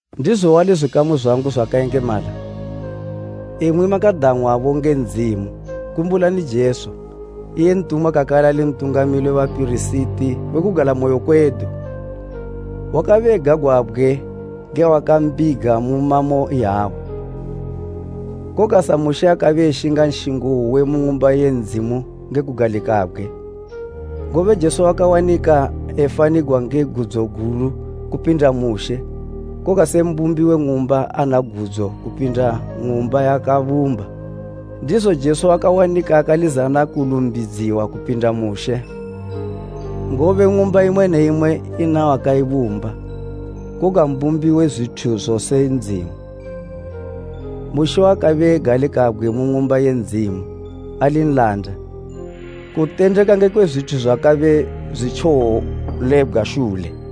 Ndizo wali zwikamu zwangu zwakayengemala, imwi makadang'wabo nge Ndzimu, kumbulani Jesu, iye ntumwa kakale ali Ntungamili we bapirisiti we kugalamoyo kwedu. Wakabe egagwabgwe nge wakambiga mu mamo iyawa, koga sa Mushe akabe eshinga nshingo uwe mu ng'umba ye Ndzimu nge kugalikabgwe. Ngobe Jesu wakawanika efanigwa nge gudzo gulu kupinda Mushe koga se mbumbi we ng'umba ana gudzo kupinda ng'umba yaakabumba. Ndizo Jesu wakawanika akalizana kulumbidziwa kupinda Mushe. Ngobe ng'umba imwe ne imwe ina wakaibumba, koga mbumbi we zwithu zose Ndzimu. Mushe wakabe egalikabgwe mu ng'umba ye Ndzimu ali nlanda, kutendeka ngekwe zwithu zwakabe zwitjowolebgwa shule.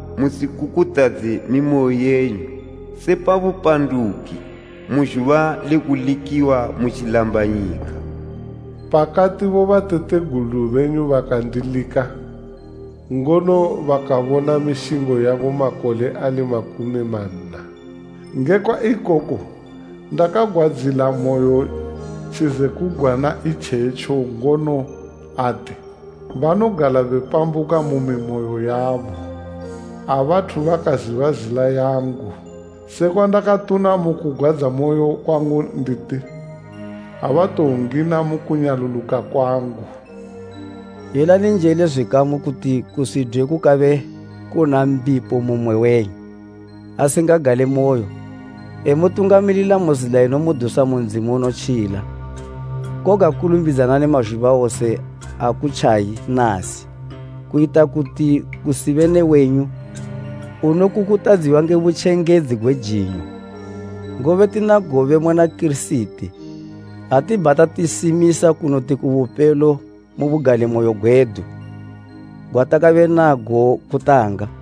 musikukutadze mimoyo yenyu, se pa bupanduki, mu zhuba le kulikiwa mu tjilambanyika, pakati bobatategulu benyu bakandilika, ngono bakabona mishingo yangu makole ali makumi manna. Ngekwa ikoko ndakagwadzilamoyo tjizekugwana itjetjo ngono ati, ‘Banogala bepambuka mu mimoyo yabo. Abathu bakaziba zila yangu.’ Sekwandakatuna mu kugwadzamoyo kwangu nditi, ‘Abatowongina mu kunyaluluka kwangu!’” Yelani njele zwikamu kuti kusidwe kukabe kuna mbipo mu mmwe wenyu, asingagale moyo, emutungamilila mu zila inomudusa mu Ndzimu unotjila. Koga kulumbidzanani mazhuba wose akutjayi “Nasi” kuyita kuti kusibe ne wenyu unokukutadziwa nge butjengedzi gwe jinyo. Ngobe tina gobe muna Kirisiti ha tibhata tisimisa kunoti kubupelo mu bugalimoyo gwedu gwatakabe nago kutanga.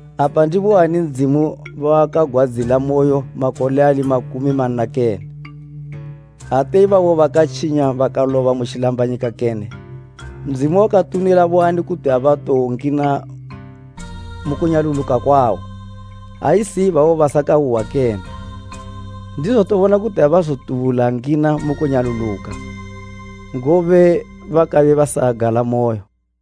Apa ndiboani Ndzimu bawakagwadzilamoyo makole ali makumi manna kene? Ate ibabo bakatjinya bakaloba mu tjilambanyika kene? Ndzimu wakatunila boani kuti abatowongina mu kunyaluluka kwawo, ha isi ibabo basakauhwa kene? Ndizo tobona kuti abazotubula ngina mu kunyaluluka, ngobe bakabe basagalamoyo.